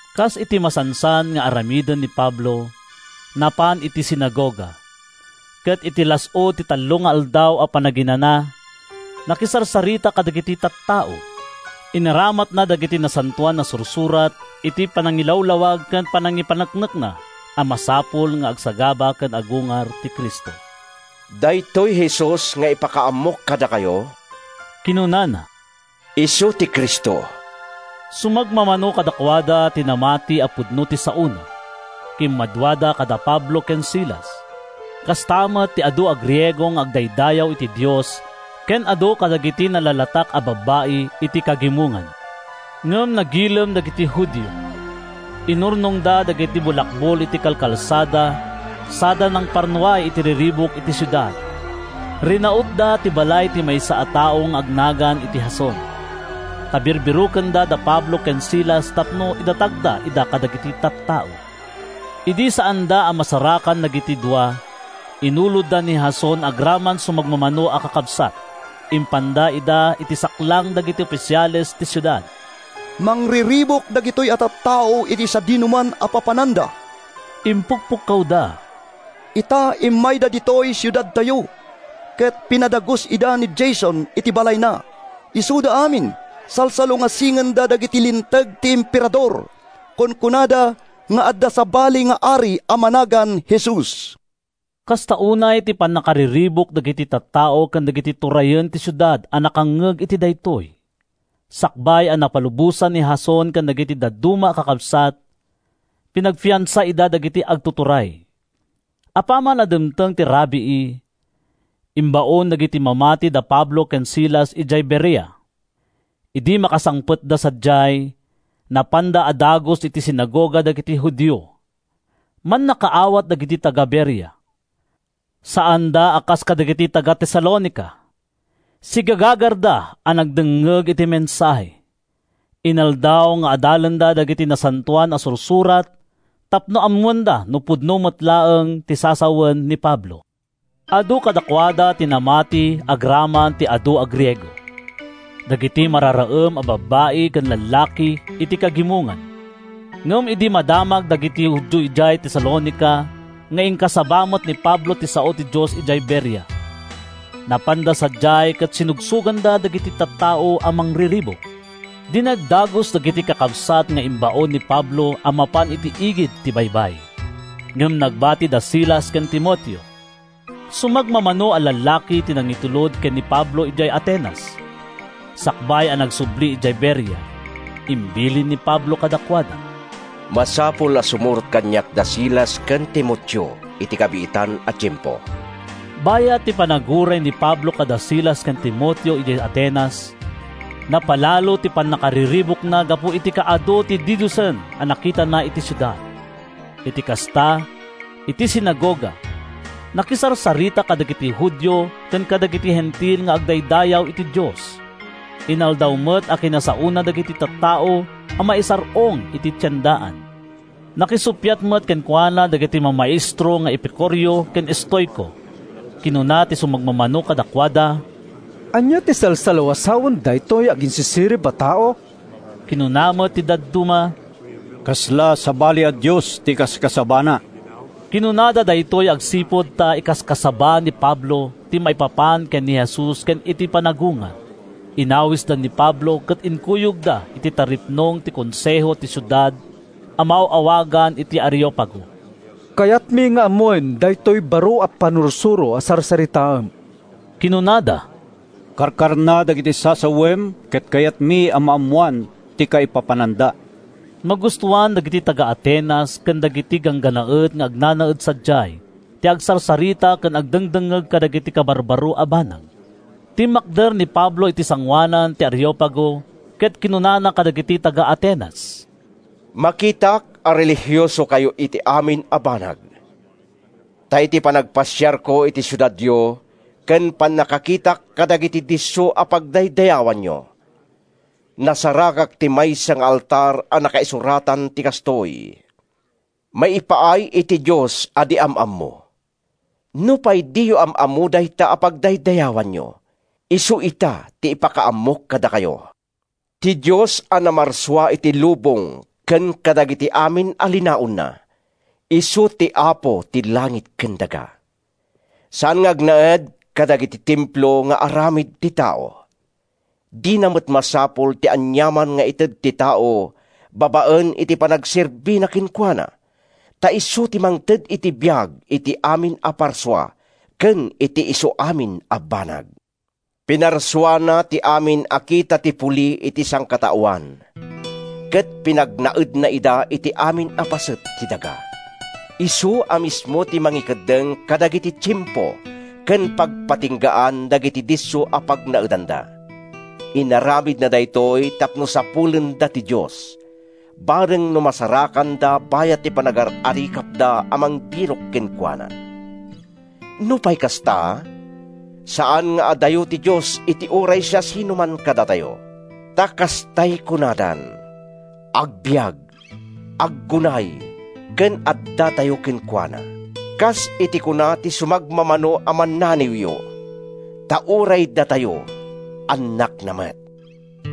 Kas iti masansan nga aramiden ni Pablo, napan iti sinagoga, ket iti las-ud ti tallo nga Aldaw a Panaginana, nakisarsarita kadagiti tattao. Inaramatna dagiti Nasantoan a Sursurat iti panangilawlawag ken panangipaneknekna a masapul nga agsagaba ken agungar ti Cristo. “Daytoy Jesus nga ipakaammok kadakayo,” kinunana, “isu ti Cristo.” Sumagmamano kadakuada ti namati a pudno ti saona. Kimmaduada kada Pablo ken Silas, kasta met ti adu a Griego nga agdaydayaw iti Dios ken adu kadagiti nalatak a babbai iti kagimongan. Ngem nagilem dagiti Judio. Inurnongda dagiti bulakbol iti kalkalsada sada nangparnuay iti riribuk iti siudad. Rinautda ti balay ti maysa a tao nga agnagan iti Jason, ta birbirokenda da Pablo ken Silas tapno idatagda ida kadagiti tattao. Idi saanda a masarakan dagiti dua, inulodda ni Jason agraman sumagmamano a kakabsat. Impanda ida iti saklang dagiti ofisiales ti siudad. “Mangriribuk dagitoy a tattao iti sadinoman a papananda,” impukpukkawda. “Ita, immayda ditoy siudadtayo, ket pinadagus ida ni Jason iti balayna. Isuda amin, salsalungasingenda dagiti linteg ti Emperador. Kunkunada nga adda sabali nga ari a managan Jesus.” Kasta unay ti pannakariribuk dagiti tattao ken dagiti turayen ti siudad a nakangngeg iti daytoy. Sakbay a napalubosan ni Jason ken dagiti dadduma a kakabsat, pinagfiansa ida dagiti agtuturay. Apaman a dimteng ti rabii, imbaon dagiti mamati da Pablo ken Silas idiay Berea. Idi makasangpetda sadiay, napanda a dagus iti sinagoga dagiti Judio. Mannakaawat dagiti taga-Berea. Saanda a kas kadagiti taga-Tesalonica. Sigagagarda a nagdengngeg iti mensahe. Inaldaw nga adalenda dagiti Nasantoan a Sursurat tapno ammoenda no pudno met laeng ti sasawen ni Pablo. Adu kadakuada ti namati agraman ti adu a Griego—dagiti mararaem a babbai ken lallaki iti kagimongan. Ngem idi madamag dagiti Judio idiay Tesalonica nga inkasaba met ni Pablo ti sao ti Dios idiay Berea, napanda sadiay ket sinugsoganda dagiti tattao a mangriribuk. Dinagdagus dagiti kakabsat nga imbaon ni Pablo a mapan iti igid ti baybay, ngem nagbati da Silas ken Timoteo. Sumagmamano a lallaki ti nangitulod ken ni Pablo idiay Atenas. Sakbay a nagsubli idiay Berea, imbilin ni Pablo kadakuada: “Masapul a sumurot kaniak da Silas ken Timoteo iti kabiitan a tiempo.” Bayat ti panaguray ni Pablo kada Silas ken Timoteo idiay Atenas, napalalo ti pannakariribukna gapu iti kaadu ti didiosen a nakitana iti siudad. Iti kasta, iti sinagoga, nakisarsarita kadagiti Judio ken kadagiti Hentil nga agdaydayaw iti Dios. Inaldaw met a kinasaona dagiti tattao a maisar-ong iti tiendaan. Nakisuppiat met kenkuana dagiti mamaestro nga Epicureo ken Estoico. Kinuna ti sumagmamano kadakuada, “Ania ti salsalawasawen daytoy aginsisirib a tao?” Kinuna met ti dadduma, “Kasla sabali a dios ti ikaskasabana.” Kinunada daytoy agsipud ta ikaskasaba ni Pablo ti maipapan ken ni Jesus ken iti panagungar. Inawisda ni Pablo ket inkuyogda iti taripnong ti konseho ti siudad a maaw-awagan iti Areopago. “Kayatmi nga ammoen daytoy baro a pannursuro a sarsaritaem,” kinunada. “Karkarna dagiti sasawem ket kayatmi a maammoan ti kaipapananda!” ( Magustoan dagiti taga-Atenas ken dagiti ganggannaet nga agnanaed sadiay ti agsarsarita ken agdengdengngeg kadagiti kabarbaro a banag.) Timmakder ni Pablo iti sangoanan ti Areopago ket kinunana kadagiti taga-Atenas, “Makitak a relihiosokayo iti amin a banag. Ta iti panagpasiarko iti siudadyo ken pannakakitak kadagiti disso a pagdaydayawanyo, nasarakak ti maysa nga altar a nakaisuratan ti kastoy: ‘Maipaay iti Dios a di Am-ammo.’ Nupay diyo am-ammo dayta a pagdaydayawanyo, isu ita ti ipakaammok kadakayo. Ti Dios a namarsua iti lubong ken kadagiti amin a linaonna, isu ti Apo ti langit ken daga. Saan nga agnaed kadagiti templo nga aramid ti tao. Dina met masapul ti aniaman nga ited ti tao babaen iti panagserbina kenkuana, ta isu ti mangted iti biag iti amin a parsua, ken iti isuamin a banag. Pinarsuana ti amin a kita ti puli iti sangkataoan, ket pinagnaedna ida iti amin a paset ti daga. Isu a mismo ti nangikeddeng kadagiti tiempo ken pagpatinggaan dagiti disso a pagnaedanda. Inaramidna daytoy tapno sapulenda ti Dios, bareng no masarakanda bayat ti panagar-arikapda a mangbirok kenkuana. Nupay kasta, saan nga adayo ti Dios iti uray siasinoman kadatayo, ta kastay kunadan, ‘Agbiag, aggunay ken addatayo kenkuana.’ Kas iti kuna ti sumagmamano a mannaniwyo, ‘Ta uray datayo, annakna met.’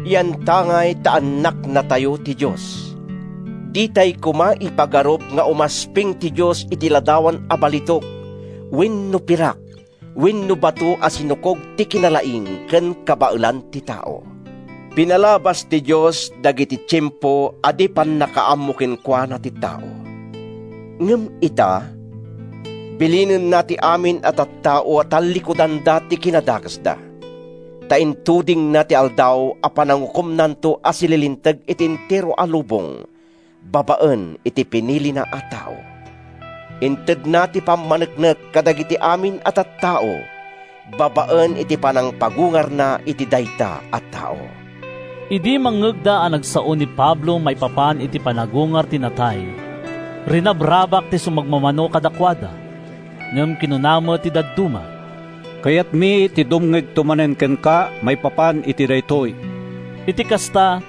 Yantangay ta annaknatayo ti Dios, ditay koma ipagarup nga umasping ti Dios iti ladawan a balitok wenno pirak wenno bato a sinukog ti kinalaing ken kabaelan ti tao. Pinalabas ti Dios dagiti tiempo a di pannakaammo kenkuana ti tao. Ngem ita, bilinenna ti amin a tattao a tallikudanda ti kinadakesda. Ta intudingna ti aldaw a panangukomnanto a sililinteg iti entero a lubong babaen iti pinilina a tao. Intedna ti pammaneknek kadagiti amin a tattao babaen iti panangpagungarna iti dayta a tao.” Idi mangngegda a nagsao ni Pablo maipapan iti panagungar ti natay, rinabrabak ti sumagmamano kadakuada, ngem kinuna met ti dadduma, “Kayatmi ti dumngegto manen kenka maipapan iti daytoy.” Iti kasta,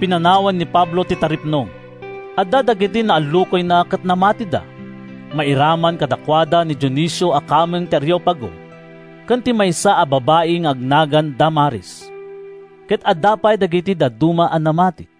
pinanawan ni Pablo ti taripnong. Adda dagiti naallukoyna ket namatida. Mairaman kadakuada ni Dionisio a kameng ti Areopago ken ti maysa a babai nga agnagan Damaris. Ket adda pay dagiti dadduma a namati.